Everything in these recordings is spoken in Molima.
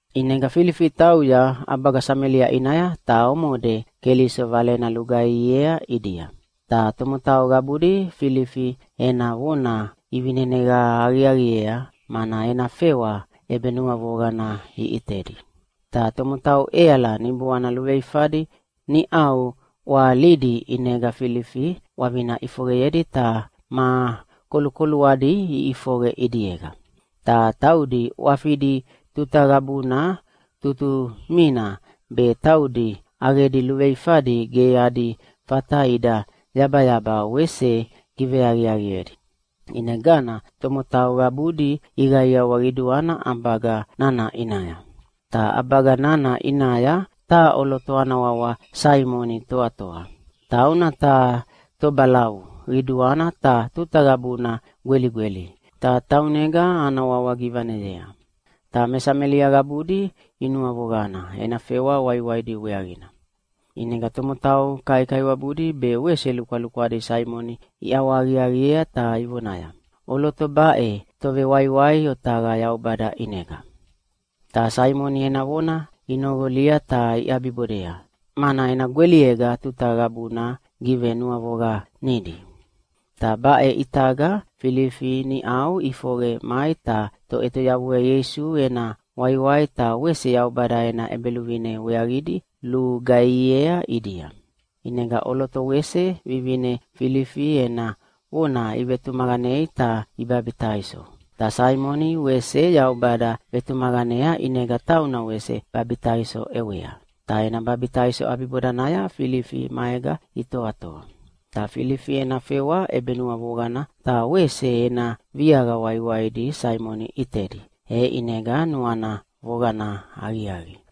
ʼInega Filifi tauya ʼabaga Samelia ʼinaya, ta omode Keliso valena lugaihiea ʼidia. Ta tomotau qabudi Filifi ena vona ivineneqa aqiaqiea, mana ena fewa ʼebenuavoqana iʼitedi. Ta tomotau ʼeala niboana luveifadi niʼau ʼwahalidi, ʼinega Filifi ʼwavina ʼifoqeyedi ta ma kolukoluadi iʼifoqe ʼidiega. Ta taudi ʼwafidi tuta qabuna tutumina be taudi ʼaqedi luveifadi ge adi fata ida yabayaba wese giveaqiaqiedi. ʼInegana tomotau qabudi iqaiawa qiduana ʼabaga nana ʼinaya. Ta ʼabaga nana ʼinaya taha ʼoloto ana wawa Saimoni toatoa. Tauna taha tobalavu qiduana ta tuta qabuna gweligweli, ta taunega ana wawa givaneyea. Ta me Samelia qabudi inuavoqana ena fewa waiwaidi weaqina. ʼInega tomotau kaikaiwabudi be wese lukwalukwadi Saimoni iʼawahaqiaqiea ta ivonaya, “ʼOloto baʼe tovewaiwai otaqa Yaubada ʼinega.” Ta Saimoni ena vona inoqolia ta iʼabibodea, mana ena gweliega tuta qabuna givenuavoqanidi. Ta baʼe ʼitaga Filifi niʼau ʼifoqe mai ta Toʼetoyavua Ieisu ena waiwai ta wese Yaubada ena ʼEbeluvine weaqidi lugaihiea ʼidia. ʼInega ʼoloto wese vivine Filifi ena vona ivetumaqanei ta ibabitaiso. Ta Saimoni wese Yaubada vetumaqanea ʼinega tauna wese babitaiso ʼewea. Ta ena babitaiso ʼabibodanaya Filifi maega itoatoa. Ta Filifi ena fewa ʼebenuavoqana ta wese ena viaqa waiwaidi Saimoni ʼitedi, e ʼinega nuana voqana aqiaqi.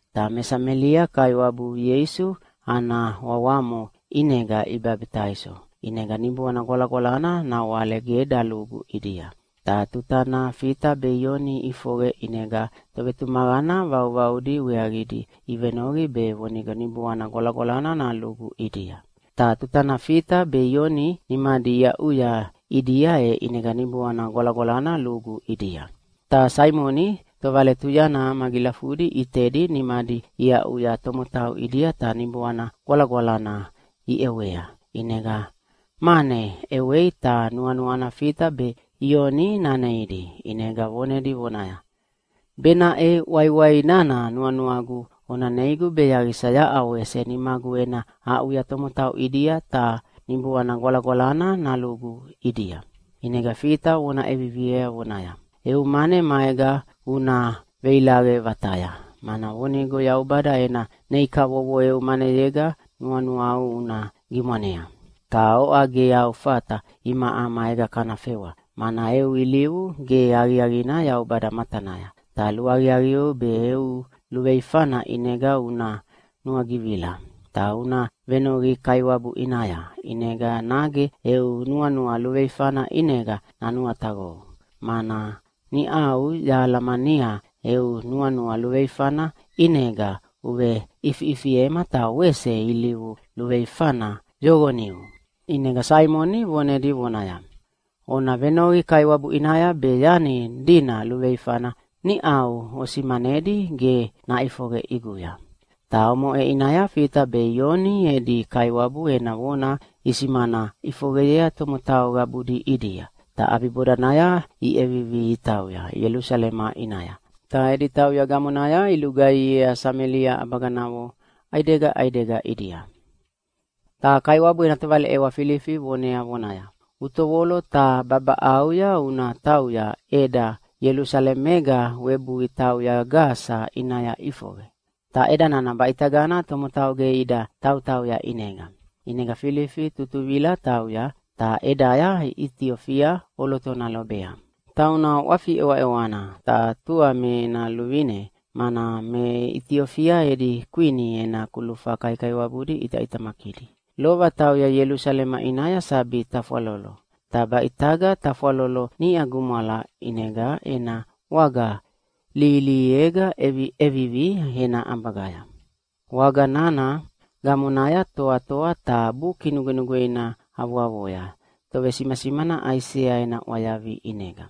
Ta me Samelia Kaiwabu Ieisu ana wawamo ʼinega ibabitaiso, ʼinega Niboana Gwalagwalana nawale ge dalugu ʼidia. Ta tutana Fita be Ioni iʼifoqe ʼinega tovetumaqana vauvaudi weaqidi ivenoqi be vonigo Niboana Gwalagwalana nalugu ʼidia. Ta tutana Fita be Ioni nimadi iaʼuya ʼidia e ʼinega Niboana Gwalagwalana lugu ʼidia. Ta Saimoni tovaletuyana magilafudi ʼitedi nimadi iaʼuya tomotau ʼidia ta Niboana Gwalagwalana iʼewea. ʼInega mane ʼewei ta nuanuana Fita be Ioni naneidi, ʼinega vonedi vonaya, “Benaʼe waiwai nana nuanuagu ona neigu be yaqisa yaʼa wese nimagu ena aʼuya tomotau ʼidia ta Niboana Gwalagwalana nalugu ʼidia.” ʼInega Fita vona ʼeviviea vonaya, “Eu mane maega una veilaqe vataya, mana vonigo Yaubada ena nei kavovo eu maneyega nuanuau una gimwanea. Ta oʼa ge au fata imaʼa maega kana fewa, mana eu ilivu ge aqiaqina Yaubada matanaya. Ta luaqiaqieu be eu luveifana ʼinega una nuagivila. Ta una venoqi Kaiwabu ʼinaya, ʼinega nage eu nuanua luveifana ʼinega nanuataqou, mana niʼau yahalamania eu nuanua luveifana ʼinega uveʼifiʼifiema ta wese ilivu luveifana yoqoniu.” ʼInega Saimoni vonedi vonaya, “Ona venoqi Kaiwabu ʼinaya be yani dina luveifana niʼau osimanedi ge naʼifoqe ʼiguya.” Ta omoʼe ʼinaya Fita be Ioni edi Kaiwabu ena vona isimana ʼifoqeyea tomotau qabudi ʼidia. Ta ʼabibodanaya iʼevivi itauya Ielusalema ʼinaya. Ta edi tauya gamonaya ilugaihiea Samelia ʼabaganavo ʼaidega ʼaidega ʼidia. Ta Kaiwabu ena tovaleʼewa Filifi vonea vonaya, “Utovolo ta babaʼauya una tauya ʼeda Ielusalemega webui tauya Gasa ʼinaya ʼifoqe. Ta ʼeda nana baʼitagana tomotau ge ida tautauya ʼinega.” ʼInega Filifi tutuvila tauya, ta ʼedaya Itiofia ʼolotona lobea. Tauna ʼwafi ʼewaʼewana, ta tua me ena luvine, mana me Itiofia edi kwini ena kulufa kaikaiwabudi ʼitaʼitamakidi. Lova tauya Ielusalema ʼinaya sabi tafwalolo, ta baʼitaga tafwalolo niʼa gumwala, ʼinega ena waga lihilihiega ʼeviʼevivi ena ʼabagaya. Waga nana gamonaya toatoa ta Buki Nugwenugweina avoavoya tovesimasimana Aisea ena ʼwayavi ʼinega.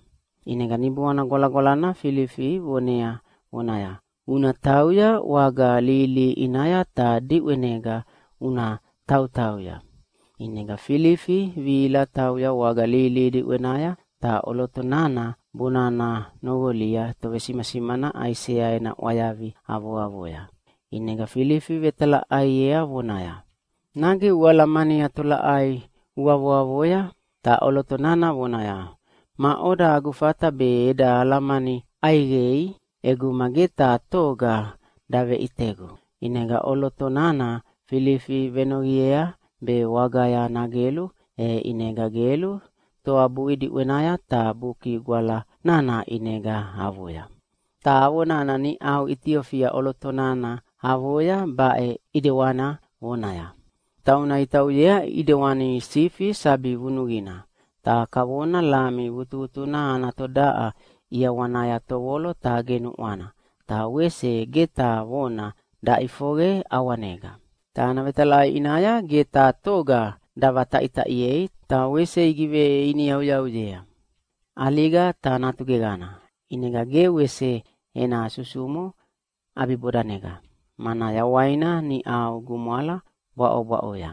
ʼInega Niboana Gwalagwalana Filifi vonea vonaya, “Una tauya waga lihilihi ʼinaya ta diʼwenega una tautauya.” ʼInega Filifi vihila tauya waga lihilihi diʼwenaya, ta ʼoloto nana bonana noqolia tovesimasimana Aisea ena ʼwayavi avoavoya. ʼInega Filifi vetalaʼaiea vonaya, “Nage ualamania tolaʼai uavoavoya?” Ta ʼoloto nana vonaya, “Maʼoda agu fata be eda alamani ʼaiqei ʼeguma ge taha toga daveʼitegu?” ʼInega ʼoloto nana Filifi venoqiea be wagaya nagelu, e ʼinega gelu toabui diʼwenaya ta Buki Gwala nana ʼinega avoya. Ta avo nana niʼau Itiofia ʼoloto nana avoya baʼe ʼidewana vonaya, “Tauna itauyea ʼidewani sifi sabi vunuqina, ta kavona lami vutuvutuna ana todaʼa ʼiawanaya tovolo ta genuʼwana, ta wese ge taha vona daʼifoqe ʼawanega. Ta ana vetalaʼai ʼinaya ge taha toga davataʼitaʼiei, ta wese igiveiniyauyauyea. ʼAliga ta natu geqana, ʼinega ge wese ena susumo ʼabibodanega, mana yawaina niʼau gumwala bwaʼobwaʼoya.”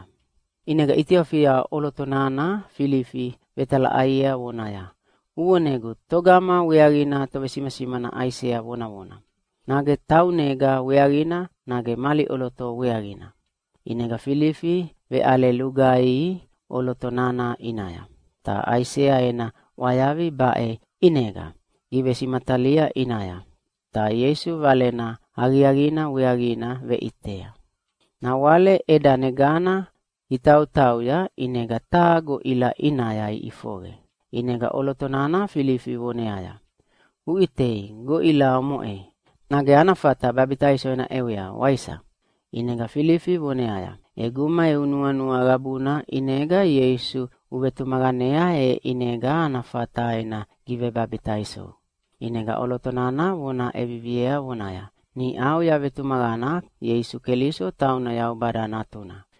ʼInega Itiofia ʼoloto nana Filifi vetalaʼaiea vonaya, “Uvonegu, togama weaqina tovesimasimana Aisea vonavona? Nage taunega weaqina, nage mali ʼoloto weaqina?” ʼInega Filifi veʼale lugaihi ʼoloto nana ʼinaya, ta Aisea ena ʼwayavi baʼe ʼinega givesimatalia ʼinaya, ta Ieisu Valena Aqiaqina weaqina veʼitea. Nawale ʼedanegana itautauya ʼinega taha goʼila ʼinaya iʼifoqe, ʼinega ʼoloto nana Filifi voneaya, “Uʼitei, goʼila omoʼe! Nage ana fata babitaiso ena ʼewea, waisa?” [ʼInega Filifi voneaya, “ʼEguma eu nuanua qabuna ʼinega Ieisu uvetumaqanea, e ʼinega ana fata ena givebabitaisou.” ʼInega ʼoloto nana vona ʼeviviea vonaya, “Niʼau yavetumaqana Ieisu Keliso tauna Yaubada Natuna.”]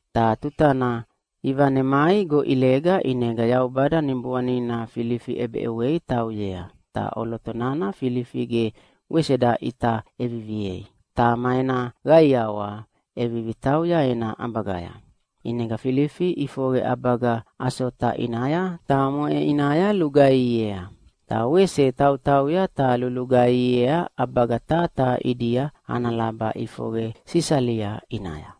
Ta tutana ivanemai goʼilega ʼinega Yaubada Niboanina Filifi ʼebeʼewei tauyea, ta ʼoloto nana Filifi ge wese daʼita ʼeviviei. Ta ma ena qaiawa ʼevivi tauya ena ʼabagaya. ʼInega Filifi ʼifoqe ʼabaga Asota ʼinaya, ta omoʼe ʼinaya lugaihiea. Ta wese tautauya ta lulugaihiea ʼabaga taha taha ʼidia ana laba ʼifoqe Sisalia ʼinaya.